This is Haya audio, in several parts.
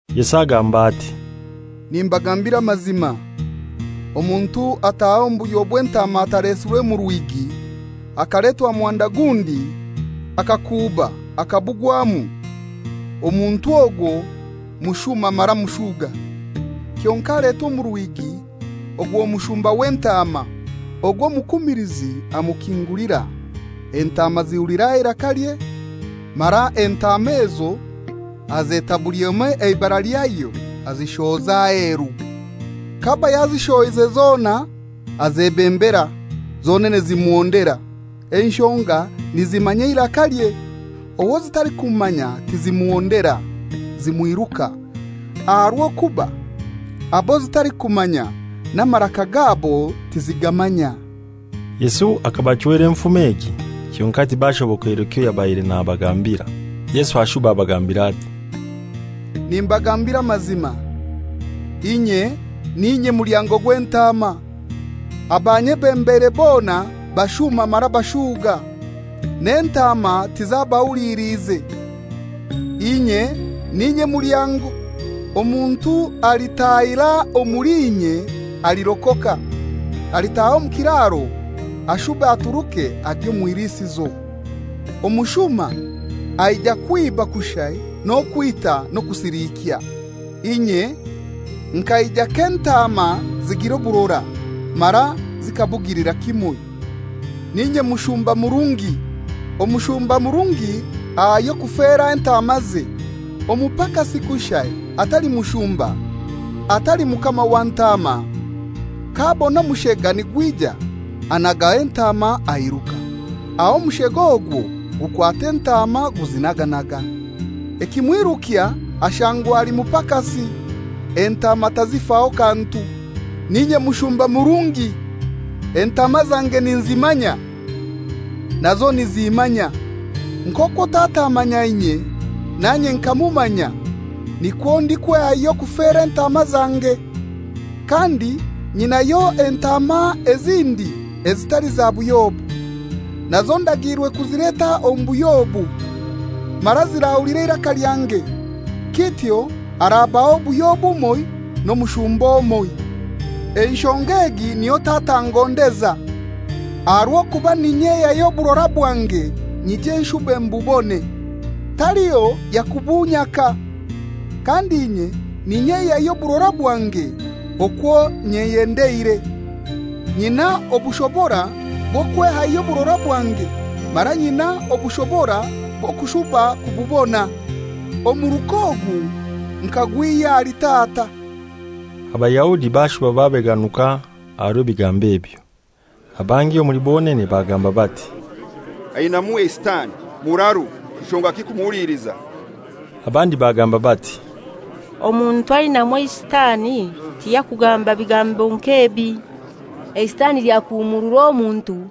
Yesu agamba ati, «Nimbagambira amazima, omuntu ataaha omu buhyo bw'entaama atalesirwe mu rwigi, akaletwa muhanda gundi akakuuba akabugwamu, omuntu ogwo mushuma mara mushuga. Kyonkai aletwa omu rwigi ogwo mushumba w'entaama. Ogwo omukumilizi amukingulira; entaama zihulira eirakalye, mara entaama ezo azeta buli emoi ibara lyayo, azishohoza aheru. K'aba yazishohoize zona azebembera, zonene zimuhondera, enshonga nizimanya eirakalye. Owo zitalikumanya tizimuhondera, zimwiruka, aha rw'okuba abo zitalikumanya n'amaraka gabo tizigamanya.» Yesu hakabachwera enfumo egi, kyonkai tibashobokeirwe kyoyabaire nabagambira. Yesu ashuba abagambira ati, «Nimbagambira amazima, inye n'inye mulyango gw'entaama. Abanyebembeire bona bashuma mara bashuuga, n'entaama tizabahuliliize. Inye n'inye mulyango. Omuntu alitaahira omuli inye alirokoka; alitaaha omu kiraro ashube aturuke agye omw'ilisizo. Omushuma aija kwiba kushai n'okwita n'okusilikya. Inye nkaija k'entaama zigira oburora, mara zikabugilira kimoi. N'inye mushumba murungi. Omushumba murungi ayehayo kufera entaamaze. Omupakasi kushai atali mushumba, atali mukama wa ntaama, k'abona omushega nigwija anagaho entaama airuka; aho omushega ogwo gukwata entaama guzinaganaga. Ekimwirukya ashangwa ali mupakasi, entaama tazifaho kantu. N'inye mushumba murungi; entaama zange ninzimanya, nazo nizimmanya; nk'okwo Tata amanya inye nanye nkamumanya, nikwo ndikwehayo kufera entaama zange. Kandi nyinayo entaama ezindi ezitali za buhyo obu. Nazo ndagiirwe kuzileta omu buhyo obu, mara zirahulira eiraka lyange. Kityo harabaho obuhyo bumoi n'omushumba omoi. Enshonga egi niyo Tata angondeza, aha rw'okuba n'inyehayo oburora bwange nyije nshube mbubone. Taliho yakubunyaka, kandi inye n'inyehayo oburora bwange okwo nyeyendeire. Nyina obushobora bw'okwehayo oburora bwange, mara nyina n'obushobora bw'okushuba kububona, omuruka ogu nkagwihya ahali Tata.» Abayahudi bashuba babeganuka aha rw'ebigambo ebyo. Abangi omuli bonene bagamba bati, «Ainaimu eisitani, muraru; nshongaki kumuhuliliza?» Abandi bagamba bati, «Omuntu ainamu eisitani tiyakugamba bigambo nk'ebi. Eisitani lyakuhumuurura omuntu?»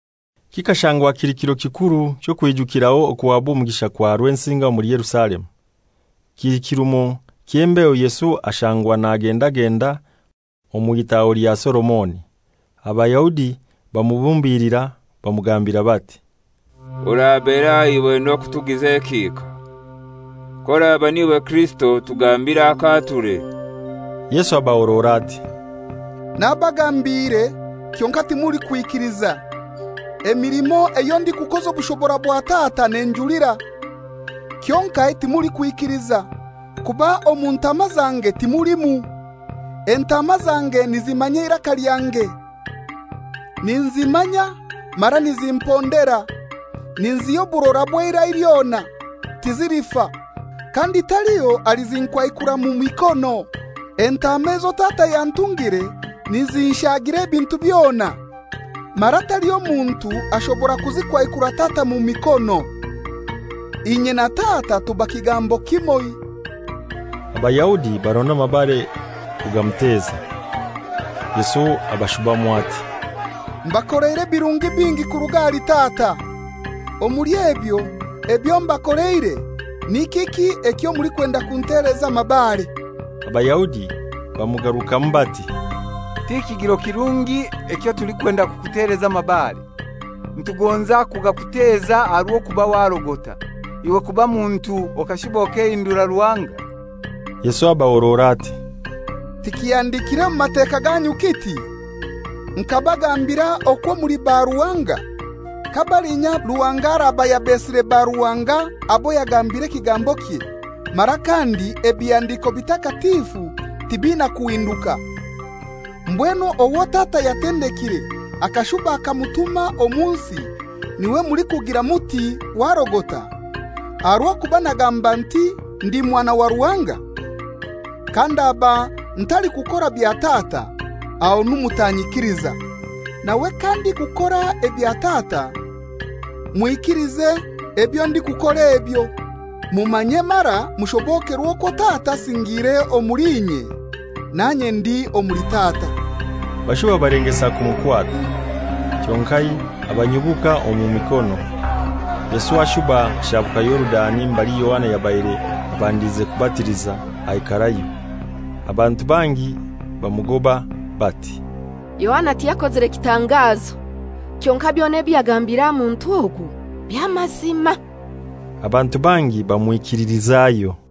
Kikashangwa kili kiro kikuru ky'okwijukiraho okuhabwa omugisha kwa Rwensinga omuli Yerusalemu. Kili kirumo ky'embeho Yesu ashangwa nagendagenda omu itaho lya Solomoni. Abayahudi bamubumbilira, bamugambira bati, «Oraberahai iwe n'okutugiza ekihika? K'oraba n'iwe Kirisito otugambire akaature.» Yesu abahorora ati, «Nabagambiire, kyonkai timulikwikiliza. Emilimo eyo ndikukoza obushobora bwa Tata nenjulira. Kyonkai timulikwikiliza, kuba omu ntaama zange timulimu. Entaama zange nizimmanya eiraka lyange, ninzimmanya, mara nizimpondera. Ninziha oburora obw'eira lyona; tizilifa, kandi taliho alizinkwaikura mu mikono. Entaama ezo Tata yantungire nizinshagira ebintu byona, mara taliho muntu ashobora kuzikwaikura Tata mu mikono. Inye na Tata tuba kigambo kimoi.» Abayahudi baronda amabare kugamuteza. Yesu abashubamu ati, «Mbakoleire ebirungi bingi kuruga ahali Tata; omuli ebyo, ebyo mbakoleire ni kiki ekyo mulikwenda kunteleza amabare?» Abayahudi bamugarukamu bati, «Ti kigiro kirungi ekyo tulikwenda kukuteleza mabare, nitugonza kugakuteza aha rw'okuba warogota; iwe kuba muntu okashuba okehindura Ruhanga?» Yesu abahorora ati, «Tikihandikire mu Mateka ganyu kiti, ‹Nkabagambira okwo muli baruhanga?› Ka balinya Ruhanga araba yabesire baruhanga abo yagambire ekigambokye, mara kandi ebihandiko bitakatifu tibina kuhinduka, mbwenu owo Tata yatendekire akashuba akamutuma omu nsi n'iwe mulikugira muti, ‹Warogota,› aha rw'okuba nagamba nti, ‹Ndi Mwana wa Ruhanga?› Kandaba ntalikukora bya Tata, ahonu mutanyikiliza; nawe kandikukora ebya Tata, mwikilize ebyo ndikukora ebyo, mumanye mara mushobokerwe okwo Tata asingiire omuli inye, nanye ndi omuli Tata.» Bashuba balengesa kumukwata, kyonkai abanyubuka omu mikono. Yesu ashuba ashabuka Yorudani mbali Yohana yabaire abandiize kubatiliza, aikarayo. Abantu bangi bamugoba bati, «Yohana tiyakozire kitangazo; kyonkai byona ebyo yagambire aha muntu ogu by'amazima.» Abantu bangi bamwikililizayo.